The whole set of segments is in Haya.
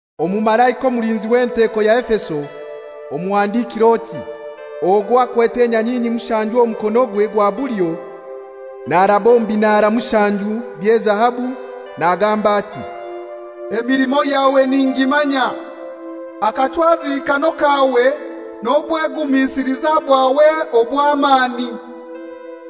Omumalaika omulinzi w'enteko ya Efeso, omuhandikire oti: «Ogwo akwete enyanyinyi mushanju omu mukonogwe gwa bulyo, naraba omu binara mushanju by'ezahabu, nagamba ati, ‹Emilimo yawe ningimanya, akachwazikano kawe n'obwegumisiliza bwawe obw'amani.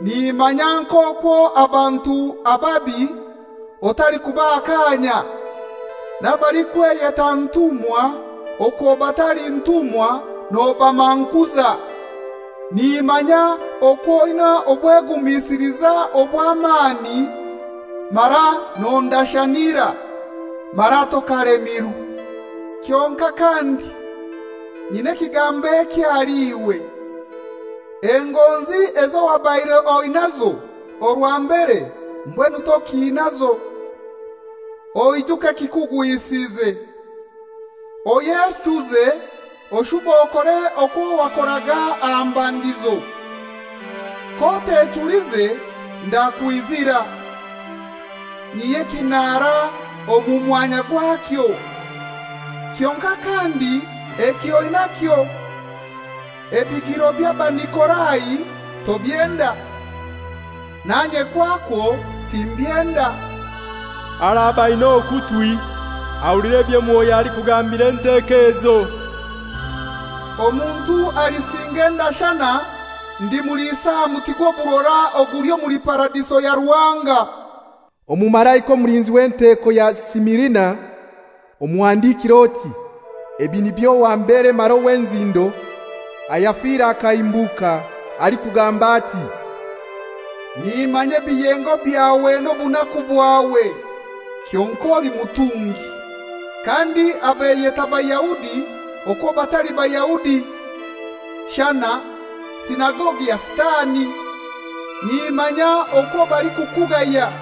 Nimanya n'okwo abantu ababi otalikubaha kaanya, n'abalikweyeta ntumwa okwo batali ntumwa nobamankuza. Nimanya okwo oina obwegumisiliza obw'amani mara nondashanira, mara tokalemirwe. Kyonkai kandi nyina ekigambo eki ahali iwe: Engonzi ezo wabaire oinaizo orwa mbere mbwenu tokinaizo. Oijuke ekikugwisize, oyechuze oshube okore okwo wakoraga aha mbandizo. K'otechulize ndakwizira, nyihye ekinara omu mwanya gwakyo. Kyonkai kandi eki oinakyo: Ebigiro by'Abanikolai tobyenda, nanye kwakwo timbyenda. Araba ainai okutwi ahulire ebyo Mwoyo alikugambira enteko ezo. Omuntu alisinga endashana ndimulisa aha muti gw'oburora oguli omuli Paradiso ya Ruhanga.›» Omumalaika omulinzi w'enteko ya Simirina omuhandikire oti, «Ebi nibyo owa mbere mara owa nzindo, ayafire akahimbuka, alikugamba, ‹Nimanya ebiyengo byawe n'obunaku bwawe (kyonkai oli mutungi), kandi abeyeta Bayahudi okwo batali Bayahudi, shana sinagogi ya Sitani, nimanya okwo balikukugaya.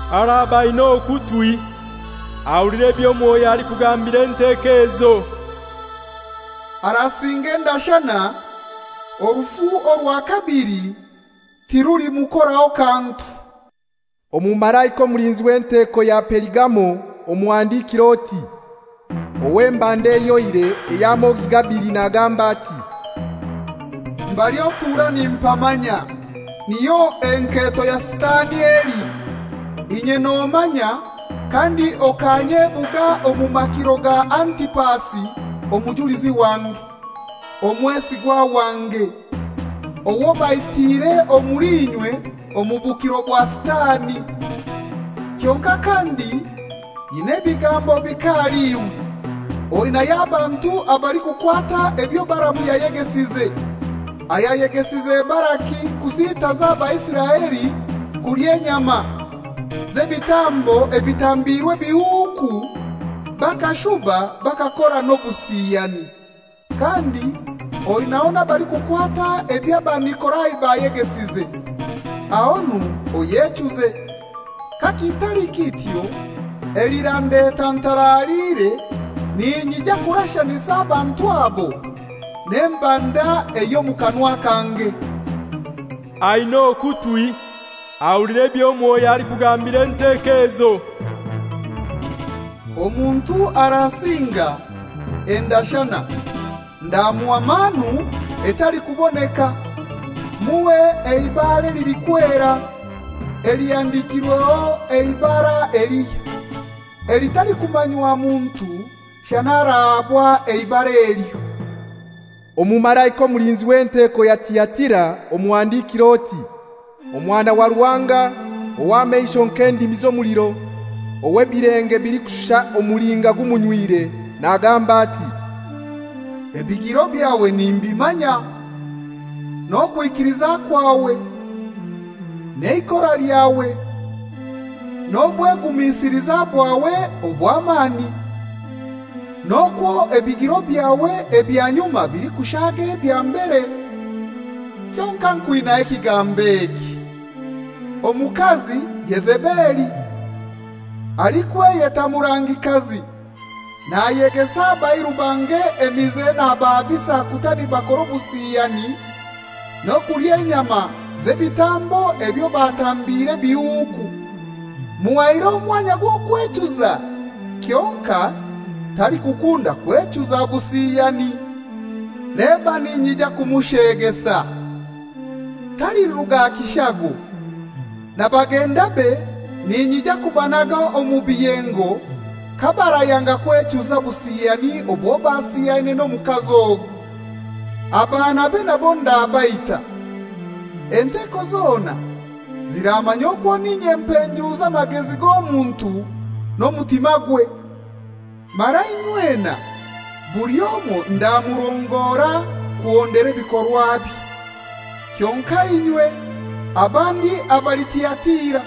Araba aina okutwi ahulire ebyo Mwoyo alikugambira enteko ezo. Arasinga endashana, orufu orwa kabili tirulimukoraho kantu.›» Omumalaika omulinzi w'enteko ya Perigamo omuhandikire oti, «Ow'embanda ehyoire ey'amogi gabili nagamba ati, ‹Mbali otura nimpamanya, niyo enketo ya Sitani eli. Inye nomanya kandi okanyebuga omu makiro ga Antipasi omujulizi wange, omwesigwa wange, owo baitiire omuli inywe omu bukiro bwa Sitani. Kyonkai kandi nyinai ebigambo bike ahali iwe: Oinayo abantu abalikukwata ebyo Balaamu yayegesize, ayayegesize Balaki kusitaza Abaisiraeli kulya enyama z'ebitambo ebitambiirwe ebihuku bakashuba bakakora n'obusiyani. Kandi oinaho n'abalikukwata eby'Abanikolai bayegesize. Ahonu oyechuze. Kakitali kityo elirandeta ntaraliire ninyija kurashanisa abantu abo n'embanda ey'omu kanwa kange. Aina okutwi ahulire ebyo Mwoyo alikugambira enteko ezo. Omuntu arasinga endashana ndamuha manu etalikuboneka, muhe eibare lilikwera elihandikirweho eibara elihya elitalikumanywa muntu shana arahabwa eibara elyo.›» «Omumalaika omulinzi w'enteko ya Tiatira omuhandikire oti: Omwana wa Ruhanga, ow'amasho nk'endimi z'omuliro, ow'ebilenge bilikushusha omulinga gumunywire, nagamba ati, ‹Ebigiro byawe nimbimanya, n'okwikiliza kwawe, n'eikora lyawe, n'obwegumisiliza bwawe obw'amani, n'okwo ebigiro byawe ebya nyuma bilikushaaga ebya mbere. Kyonkai nkwinaho ekigambo eki: Omukazi Yezebeli, alikweyeta murangikazi nayegesa abairu bange emize nabahabisa kuta nibakora obusiyani n'okulya enyama z'ebitambo ebyo batambiire ebihuku. Muhaire omwanya gw'okwechuza, kyonkai talikukunda kwechuza busiyani. Leba ninyija kumusheegesa, taliruga aha kishago, na bagendabe ninyija kubanaga omu biyengo kabarayanga kwechuza obusiyani obwo basiyaine n'omukazi ogwo. Abaanabe nabo ndabaita. Enteko zona ziramanya okwo n'inye mpenjuuza amagezi g'omuntu n'omutimagwe, mara inywena buli omoi ndamurongora kuhondera ebikorwabye. Kyonkai inywe abandi abali Tiatira,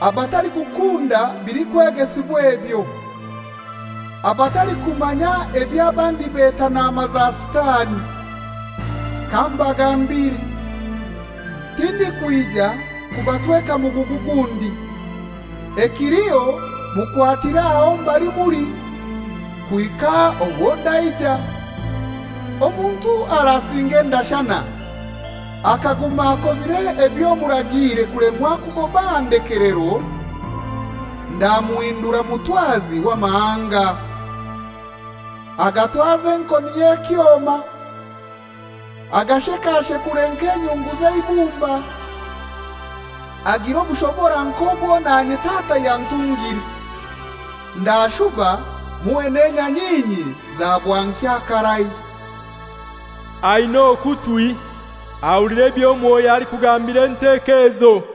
abatalikukunda bilikwegesibwa ebyo, abatalikumanya eby'abandi beta naama za Sitani, kambagambire, tindikwija kubatweka mugugu gundi, ekiliho mukwatire aho mbali muli, kuhika orwo ndaija. Omuntu arasinga endashana, akaguma akozire ebyo muragiire kulemwa kugoba aha ndekelero, ndamuhindura mutwazi w'amahanga, agatwaze enkoni y'ekyoma, agashekashekure nk'enyungu z'eibumba; agire obushobora nk'obwo nanye Tata yantungire. Ndashuba muhe n'enyanyinyi za bwankya karai. Ainai okutwi ahulire ebyo Mwoyo alikugambira enteko ezo.›»